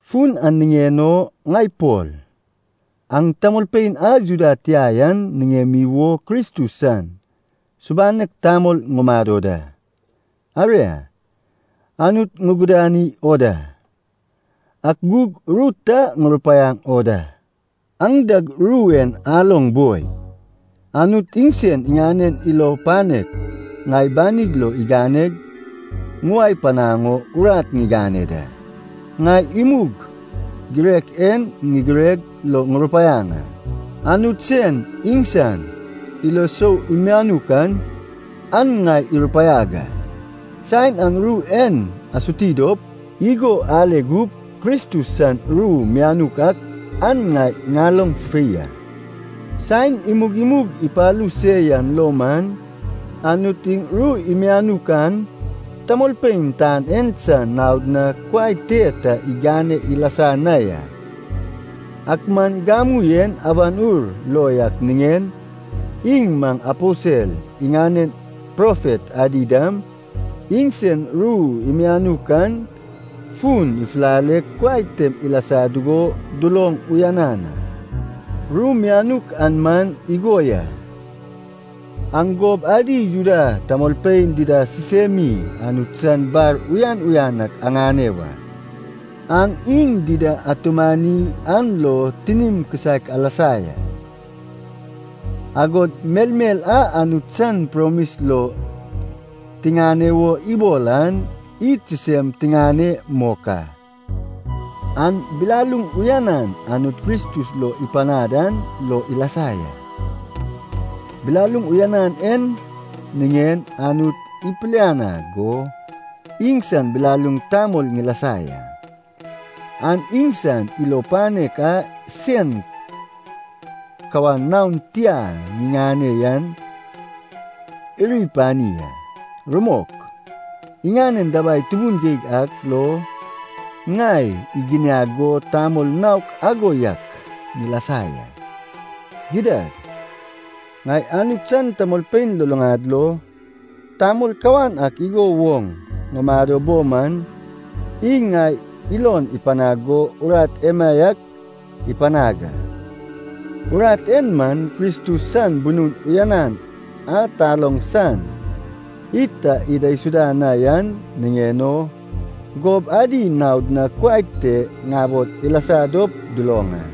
Fun an niŋen o, ŋai Pol, aŋ tamolpein a Juda tia yan niŋemi wo Kristus san subanek tamol ŋumado da. Aria, Anut ŋugudani wo da, ak gug ru ta ŋurupaiaŋ o da. Aŋ dag ru en aloŋ boi. Anut iŋsen iŋanen ilo panek ŋai banig lo iganeg ŋuwae panaŋ o urat ŋigane da. Ŋai imug girek en ŋigireg lo ŋurupaiaŋ a, Anut sen iŋsan ilo sou mianuk an, an ŋai irupaiag a. Saen aŋ ru en asuti dop, igo ale gup, Kristus san ru mianuk ak an ŋai ŋaloŋ fufei a. Saen imug imug ipalu se yan lo man, Anut iŋ ru imianuk an tamolpein tan en san naod na kuai te ta igane ilasa na ya. Ak man gamu en Awan Ur lo yak niŋen, iŋ maŋ aposel iŋanen profet adi dam, iŋsen ru imianuk an fun ifulaleg kuai tem ilasa dugo duloŋ uyanan a. Ru mianuk an man igo ya, aŋ gob adi Juda tamolpein dida sisemi Anut san bar uyan uyan ak aŋane wa. Aŋ iŋ dida atumani an lo tinim kisaek alasa ya. Agod melmel a Anut san promis lo tiŋane wo ibol an, id sisem tiŋane mok a. An bilaluŋ uyanan Anut Kristus lo ipanad an lo ilasa ya. Bilaluŋ uyanan en niŋen, Anut ipilianag go iŋsan bilaluŋ tamol ŋilasa ya. An iŋsan ilo panek a sen kawan naon tia ŋiŋane yan iri pani a. Rumok, iŋanen dabai tubun geig ak lo ŋai iginiag go tamol naok ago yak ŋilasa ya. Gidad, ŋai Anut san tamolpein luluŋad lo, tamol kawan ak igo woŋ ŋumado bo man, iŋ ŋai ilon ipanag go urat emaiak ipanag a. Urat en man, Kristus san bunun uyanan a taloŋ san id ta idaisuda na yan niŋen o, gob adi naod na kuai te ŋabol ilasa dop duloŋ a.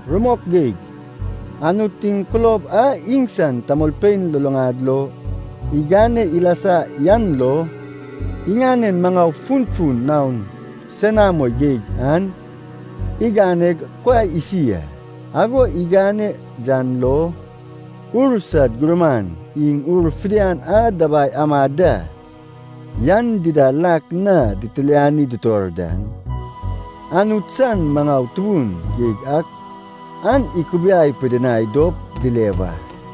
Rumok geig, Anut iŋ kulob a iŋsan tamolpein luluŋad lo igane ilasa yan lo, iŋanen maŋau funfun naon senamo geig an iganeg kuai isi a. Ago igane yan lo, ur sad gurman iŋ ur fidian a dabai amad da yan dida lak na ditilani dutor dan, Anut san maŋau tubun geig ak an ikubiai pidinai dop dile wa.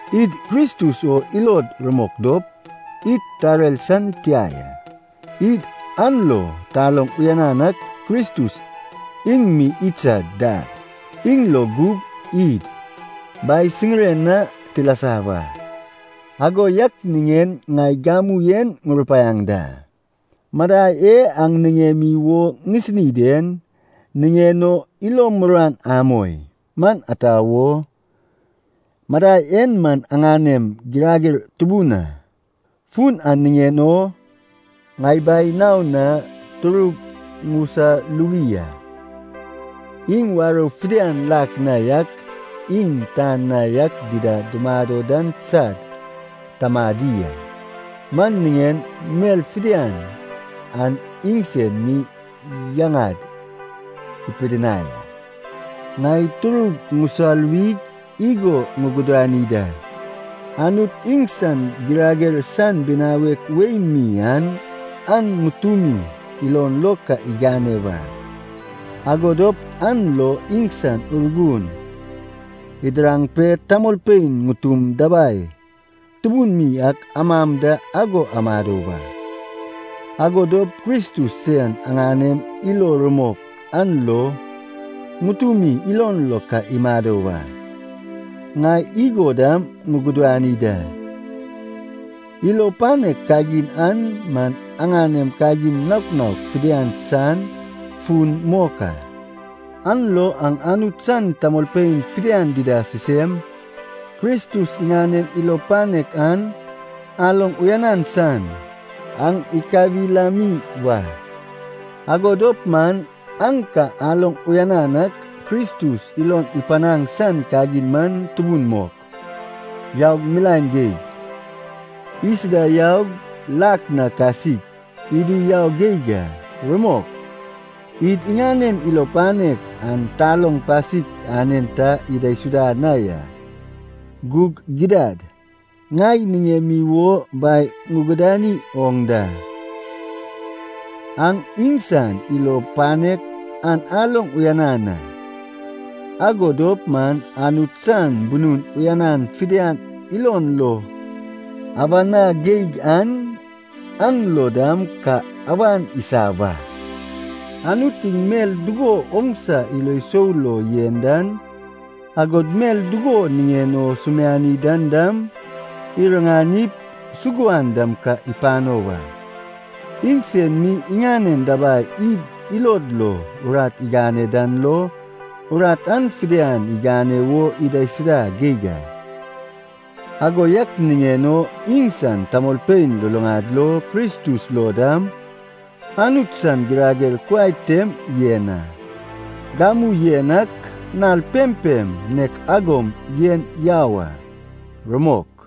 Id Kristus o ilod rumok dop, id tarer san tia ya. Id an lo taloŋ uyanan ak Kristus iŋ mi idsad dal. Iŋ lo gup id Bai siriŋen na tilasa wa. Ago yak niŋen ŋai gamu en ŋurupaiaŋ da, madai e aŋ niŋemi wo ŋisini den niŋen o ilom muruan amoi. Man ata wo? Madai en man aŋanem girager tubun a. Fun an niŋen o ŋai Bai naon na turug ŋusaluwi a. Iŋ warou fidian lak na yak iŋ tan na yak dida dumado dan sad Tamadi a. Man niŋen mel fidian an iŋsen mi yaŋad ipidinai a. Ŋai turug ŋusaluwig igo ŋugudani da, Anut iŋsan girager san binawek wei mi an aŋ ŋutumi ilon lo ka igane wa. Ago dop an lo iŋsan Urgun idiraŋ pe tamolpein ŋutum dabai tubun mi ak amam da ago amado wa. Ago dop Kristus sen aŋanem ilo rumok an lo ŋutumi ilon lo ka imado wa. Ŋai igo dam ŋugudani da, ilo panek kagin an man aŋanem kagin naok naok fidian san fun mok a. An lo aŋ Anut san tamolpein fidian dida sisem, Kristus iŋanen ilo panek an aloŋ uyanan san, aŋ ikawilami wa. Ago dop man aŋ ka aloŋ uyanan ak, Kristus ilon ipanaŋ san kagin man tubun mok, yaug milaen geig, isida yaug lak na kasik, idu yau geig a. Rumok, id iŋanen ilo panek an taloŋ pasik anen ta idaisuda na ya. Gug gidad, ŋai niŋemi wo Bai ŋugudani oŋ da, aŋ iŋsan ilo panek an aloŋ uyanan a, ago dop man Anut san bunun uyanan fidian ilon lo awa na geig an, aŋ lo dam ka awan isa wa. Anut iŋ mel dugo oŋsa ilo sou lo yen dan, agod mel dugo niŋen o sumiani dan dam, iriŋanip, suguan dam ka ipano wa. Iŋsen mi iŋanen dabai id ilod lo urat igane dan lo, urat an fidian igane wo idaisuda geig a. Ago yak niŋen o, iŋsan tamolpein luluŋad lo, Kristus lo dam, Anut san girager kuai tem yen a, gamu yen ak, nal pempem nek agom yen yau a. Rumok.